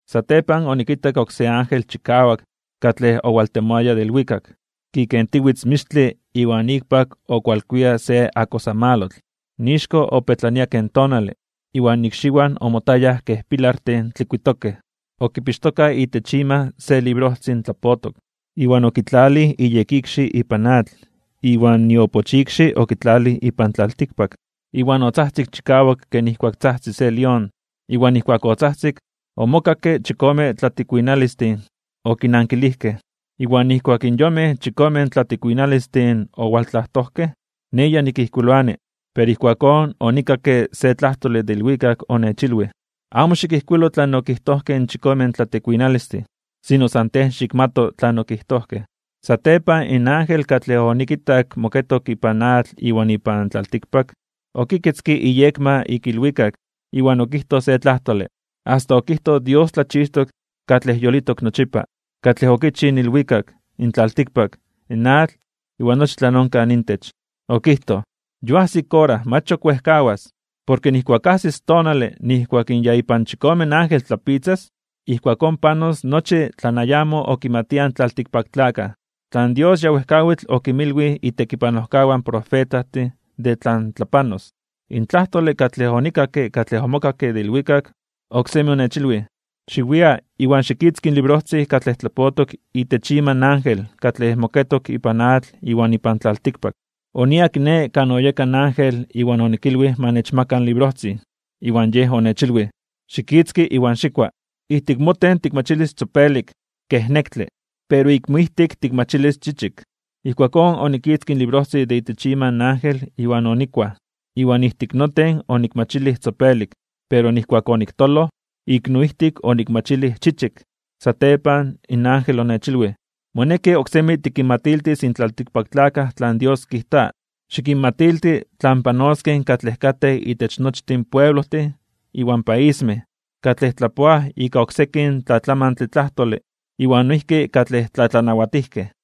Satepan onikitak oksé ángel chikawak katlej owaltemoaya de ilwikak, kikentiwitz mixtle iwan ikpak okualkuia se akosamalotl. Ixko opetlania ken tonale, iwan ikxiwan omotayaj kej pilartin tlikuitokej. Okipixtoka itech ima se librojtzin tlapotok, iwan okitlalij iyekikxi ipan atl iwan iopochikxi okitlalij ipan tlaltikpak. Iwan otzajtzik chikawak ken ijkuak tzajtzi se lión. Iwan nijkuak otzajtzik, omokakke chikome tlatikuinalistin okinankilijkej. Iwan nijkuak in yonmej chikome tlatikuinalistin owaltlajtojkej, nej ya nikijkuiloani, pero ijkuakón onikakke se tlajtole de ilwikak onechilwij: ―Amo xikijkuilo tlan okijtojkej in chikome tlatikuinalistin, sino san tej xikmato tlan okijtojkej. Satepan in ángel katlej onikitak moketok ipan atl iwan ipan tlaltikpak, okiketzke iyekma ik ilwikak iwan okijtoj se tlajtole, asta okijtoj Dios tlachixtok katlej yolitok nochipa, katlej okichij in ilwikak, in tlaltikpak, in atl, iwan nochi tlan onkaj intech. Okijtoj: ―Ya ajsis ora, mach ok wejkawas. Porke nijkuak ajsis tonale nijkuak in ya ipan chikome ángel tlapitzas, ijkuakón panos nochi tlan ayamo okimatiaj in tlaltikpaktlakaj, tlan Dios ya wejkawitl okinmilwij itekipanojkawan profetajtin de tlan tlapanos. In tlajtole katlej onikakke katlej omokakke de ilwikak, oksemi onechilwij: ―Xiwia, iwan xikitzki in librojtzin katlej tlapotok itech ima in ángel katlej moketok ipan atl iwan ipan tlaltikpak. Oniaj kiné kan oyeka in ángel iwan onikilwij ma nechmaka in librojtzin, iwan yej onechilwij: ―Xikitzki iwan xikua. Ijtik moten tikmachilis tzopelik kej nektle, pero ik moijtik tikmachilis chichik. Ijkuakón onikitzkij in librojtzin de itech ima in ángel iwan onikuaj. Iwan ijtik noten onikmachilij tzopelik, pero nijkuak oniktoloj, ik noijtik onikmachilij chichik. Satepan in ángel onechilwij: ―Moneki oksemi tikinmatiltis in tlaltikpaktlakaj tlan Dios kijta. Xikinmatilti tlan panoskej katlej katej itech nochtin pueblojtin iwan paismej, katlej tlapoaj ika oksekin tlatlamantle tlajtole iwan noijki katlej tlatlanawatijkej.